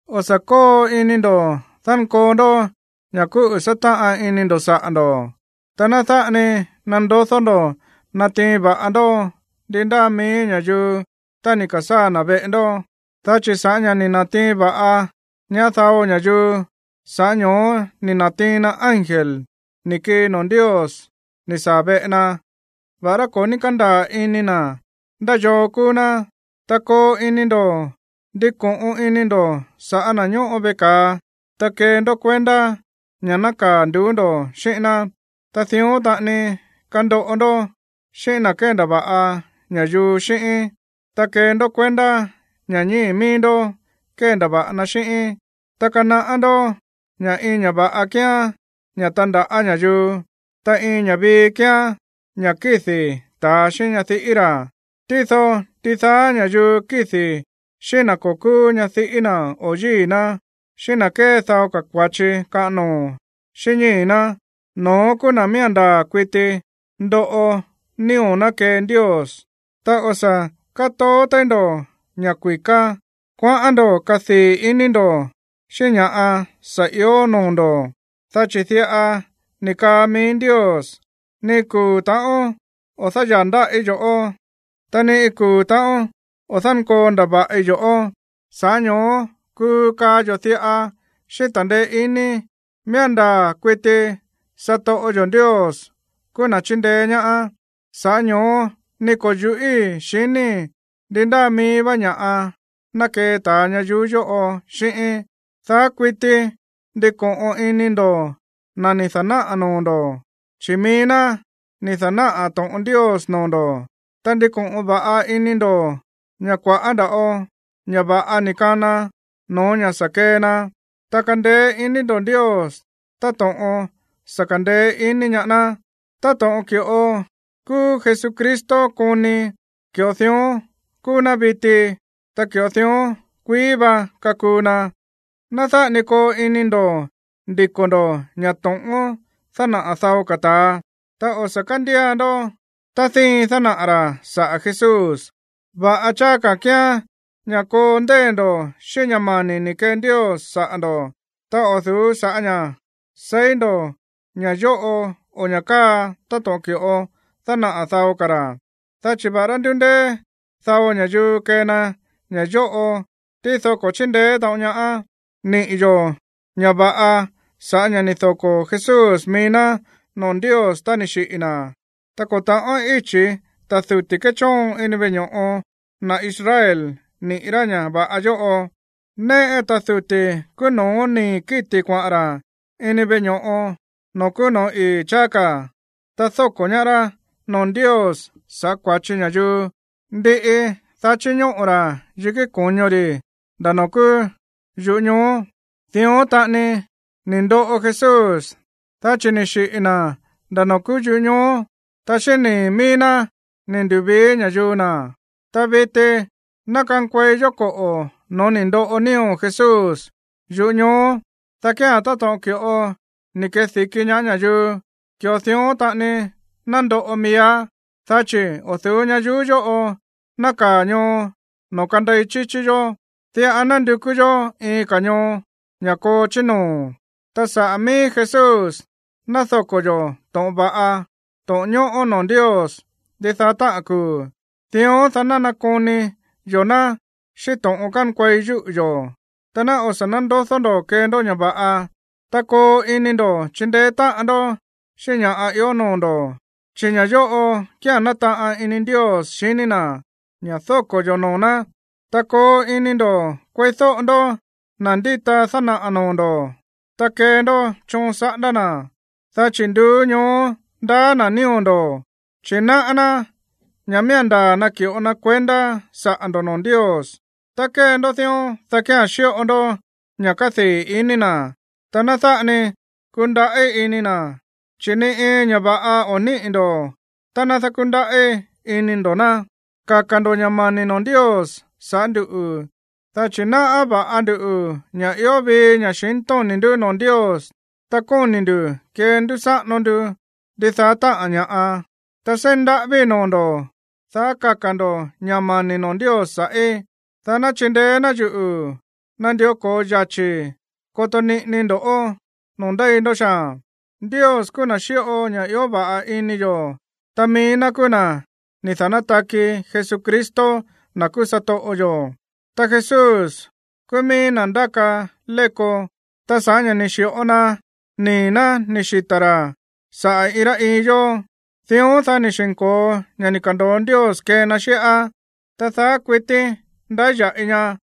O̱ sa̱ kóo ini ndo̱ dánkoo ndó ña̱ kúꞌu̱ sátáꞌan ini ndo̱ saꞌa̱ ndo̱. Ta ná dáꞌa ni nandodó ndo̱ natiin va̱ꞌa ndó ndi ndáa mií ña̱yuu tá ni̱ ka̱sáa̱ na̱ veꞌe ndó, dá chi̱ sa̱ꞌá ña̱ ni̱ na̱tiin va̱ꞌa ñaá dao ña̱yuu, sa̱ꞌá ño̱ó ni̱ na̱tiin na ángel ni̱ kii noo̱ Ndios ni̱ saa̱ veꞌe na, va̱ꞌará ko̱ ní kándaa̱ ini na̱ ndá yoo kúú ná. Ta koo ini ndo̱ ndiko̱ꞌon ini ndo̱ sa̱ꞌá na̱ ñóꞌo veꞌe ka̱a, ta kee ndó kuendá ña̱ nákaa̱ nduú ndo̱ xíꞌín ná. Ta dión taꞌani kandoꞌo ndó xíꞌín na̱ kéndava̱ꞌa ña̱yuu xíꞌín, ta kee ndó kuendá ña̱ ñíi̱ mií ndó kéndava̱ꞌa na xíꞌín. Ta kanaꞌá ndó ña̱ iin ña̱ va̱ꞌa kíán ña̱ tándaꞌa̱ ña̱yuu. Ta iin ña̱ vii kíán ña̱ kídi̱ ta̱a xíꞌín ñadiꞌí ra̱. Tído ndidaá ña̱yuu kídi̱ xíꞌín na̱ ko̱ kúú ñadiꞌí na̱ o yíi̱ ná, xíꞌín na̱ kée dao ka̱ kua̱chi kaꞌan noo̱ xíꞌín ñíi̱ ná, no̱ón kúú na̱ miía̱n ndaa̱ kuiti ndoꞌo nío̱ ná kee Ndios. Ta o̱ sa̱ kátoó téí ndo̱ ña̱ kui̱ká, kuaꞌán ndo̱ kadii̱ iní ndo̱ xíꞌín ña̱ꞌa sa̱ ió noo̱ ndo̱, dá chi̱ diꞌa ni̱ kaa mií Ndios: “Ni iin kuu̱ ta̱ꞌón o̱ dáyaa̱ ndáꞌí yo̱ꞌó, ta ni kuu̱ ta̱ꞌón o̱ dánkoo ndava̱ꞌi yo̱ꞌó.” Sa̱ꞌá ño̱ó kuu kaa yo̱ diꞌa xíꞌín ta̱ndeé iní: Miía̱n ndaa̱ kuiti satoꞌo yo̱ Ndios kúú na̱ chíndeé ñaá, sa̱ꞌá ño̱ó ni ko̱ yu̱ꞌíi̱ xiníi̱ ndi ndáa mií vá ña̱ꞌa ná kee ta̱a ñayuú yóꞌo xíꞌíín. Daá kuití ndiko̱ꞌon ini ndo̱ na̱ ni̱ da̱náꞌa̱ noo̱ ndo̱, chi̱ mií ná ni̱ da̱náꞌa̱ to̱ꞌon Ndios noo̱ ndo̱. Ta ndiko̱ꞌon va̱ꞌa ini ndo̱ ña̱ kua̱ꞌá nda̱ꞌo ña̱ va̱ꞌa ni̱ kana no̱ó ña̱ sa̱ kee na, ta kandeé iní ndo̱ Ndios táto̱ꞌon sa̱ ka̱ndeé iní ñaá ná. Táto̱ꞌon ki̱ꞌo kúú Jesucristo koni, ki̱ꞌo dión kúú ná viti, ta ki̱ꞌo dión kuií va kakuu na. Ná dáꞌa ni koo ini ndo̱ ndiko̱ ndo̱ ña̱ to̱ꞌón dánaꞌa̱ dao ka̱ ta̱a, ta o̱ sa̱ kándía ndó tá díin dánaꞌa̱ ra̱ saꞌa̱ Jesús. Va̱ꞌa cháá ka̱ kíán ña̱ koo ndeé ndo̱ xíꞌín ña̱ mani̱ ni̱ kee Ndios saꞌa̱ ndo̱, ta o̱ du̱ú sa̱ꞌá ña̱ seí ndo̱ ña̱ yóꞌo o ña̱ káa táto̱ꞌon ki̱ꞌo dánaꞌa̱ dao ka̱ ra̱. Dá chi̱ va̱ꞌará ndúndéé dao ña̱yuu kée na ña̱ yóꞌo, tído ko̱ chíndeé taꞌon ñaá. Níꞌi̱ yo̱ ña̱ va̱ꞌa sa̱ꞌá ña̱ ni̱ doko̱ Jesús mií ná noo̱ Ndios tá ni̱ xiꞌi̱ na̱. Ta ko̱ ta̱ꞌón íchi̱ ta̱ duti̱ kéchóon ini veꞌe ño̱ꞌo na̱ Israel niꞌi̱ rá ña̱ va̱ꞌa yóꞌo. Néꞌe ta̱ duti̱ kúú no̱ó nii̱ kíti̱ kuaꞌa̱n ra̱ ini veꞌe ño̱ꞌo noo̱ kúú no̱ó ii̱ cháá ka̱, ta dóko̱ ñaá rá noo̱ Ndios sa̱ꞌá kua̱chi ña̱yuu. Ndiꞌi, dá chíñóꞌo̱ ra̱ yikí ko̱ño ri̱ nda̱ noo̱ kúú yuꞌú ñoo. Dión taꞌani ni̱ ndoꞌo Jesús, dá chi̱ ni̱ xiꞌi̱ na̱ nda̱ noo̱ kúú yuꞌú ñoo, ta xíꞌín nii̱ mií ná ni̱ ndu̱vii ña̱yuu na̱. Ta viti ná kankuei yó koꞌo̱ no̱ó ni̱ ndoꞌo nío̱ Jesús yuꞌú ñoo, dá kía̱n táto̱ꞌon ki̱ꞌo ni̱ kedi̱ki ñaá ña̱yuu, ki̱ꞌo dión taꞌani ná ndoꞌo miíá. Dá chi̱ o̱ du̱ú ñayuú yóꞌo nákaa̱ ñoo noo̱ kandei chíchí yó. Diꞌa nandukú yó iin ka̱ ñoo, ña̱ koo chí noo̱. Ta saꞌa̱ mií Jesús ná doko̱ yo̱ to̱ꞌon va̱ꞌa, to̱ꞌon ñóꞌó noo̱ Ndios ndidaá táꞌa̱n kuu̱, dión dá nakoni yo̱ ná xíꞌín to̱ꞌon kánkuei yúꞌu̱ yo̱. Ta ná o̱ sa̱ nándodó ndo̱ kee ndó ña̱ va̱ꞌa, ta koo ini ndo̱ chindeé táꞌan ndó xíꞌín ña̱ ió noo̱ ndo̱, chi̱ ña̱ yóꞌo kía̱n nátaꞌan ini Ndios xiní na̱, ña̱ dóko̱ yo̱ noo̱ ná. Ta koo ini ndo̱ kueídóꞌo ndó na̱ ndíta dánaꞌa̱ noo̱ ndo̱, ta kee ndó choon saꞌándá na̱, dá chi̱ nduú ñoó ndaá na̱ nío̱ ndo̱, chi̱ náꞌá ná ña̱ miía̱n ndaa̱ naki̱ꞌo na kuendá saꞌa̱ ndo̱ noo̱ Ndios. Tá kée ndó dión, dá kía̱n xíꞌo ndó ña̱ kádii̱ iní na̱, ta ná dáꞌa ni kundaꞌí ini na̱, chi̱ ni iin ña̱ va̱ꞌa o̱ níꞌi̱ ndo̱ tá ná dákúndaꞌí ini ndo̱ ná. Kaka̱ ndo̱ ña̱ mani̱ noo̱ Ndios sa̱ꞌá nduꞌu̱, dá chi̱ náꞌá va̱ꞌa ndu ña̱ ió vii ña̱xintóni̱ ndú noo̱ Ndios, ta kóni̱ nduꞌu̱ kendúsáꞌano ndu ndidaá táꞌa̱n ña̱ꞌa. Ta seí ndaꞌávíi̱ noo̱ ndo̱ ña̱ daá kaka̱ ndo̱ ña̱ mani̱ noo̱ Ndios sa̱ꞌí, dá ná chindeé ná yuꞌu̱ nandió ko̱o yachi̱i̱ koto niꞌinii ndo̱ꞌó noo̱ ndéi ndó xaa̱n. Ndios kúú na̱ xíꞌo ña̱ ió va̱ꞌa ini yo̱, ta mií ná kúú na̱ ni̱ da̱nátaki Jesucristo, na̱ kúú satoꞌo yo̱, ta Jesús kúú míí na̱ ndáka léko, ta sa̱ꞌá ña̱ ni̱ xi̱ꞌo na nii̱ ná ni̱ xita̱ ra̱ saꞌa̱ iin rá iin yó, dión, dá ni̱ xi̱nko̱o ña̱ ni̱ ka̱ndo̱o Ndios kee na xíꞌá, ta daá kuití ndáya̱ꞌi ña.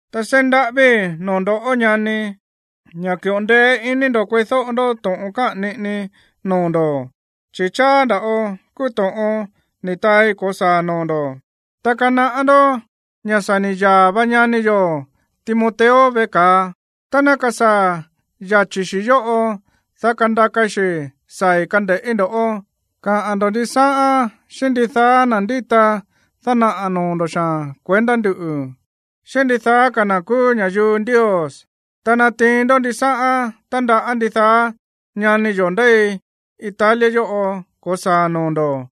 Ta seí ndaꞌávíi̱ noo̱ ndo̱, ñani, ña̱ ki̱ꞌo ndeé iní ndo̱ kueídóꞌo ndó to̱ꞌon káꞌa̱n niꞌinii noo̱ ndo̱, chi̱ cháá nda̱ꞌo kúú to̱ꞌon ni̱ taai ko̱saa̱ noo̱ ndo̱. Ta kanaꞌá ndó ña̱ sa̱ ni̱ yaa̱ va ñani yo̱ Timoteo veꞌe ka̱a. Tá ná kasaa̱ yachi̱ xi yóꞌo, dá kandakai xi̱ saa̱i̱ kande̱ꞌí ndo̱. Kaꞌa̱n ndo̱ ndisáꞌán xíꞌín ndidaá na̱ ndíta dánaꞌa̱ noo̱ ndo̱ xaa̱n kuendá nduꞌu̱, xíꞌín ndidaá ka̱ na̱ kúú ña̱yuu Ndios. Ta natiin ndó ndisáꞌán tándaꞌá ndidaá ñani yo̱ ndéi Italia yóꞌo ko̱saa̱a̱n noo̱ ndo̱.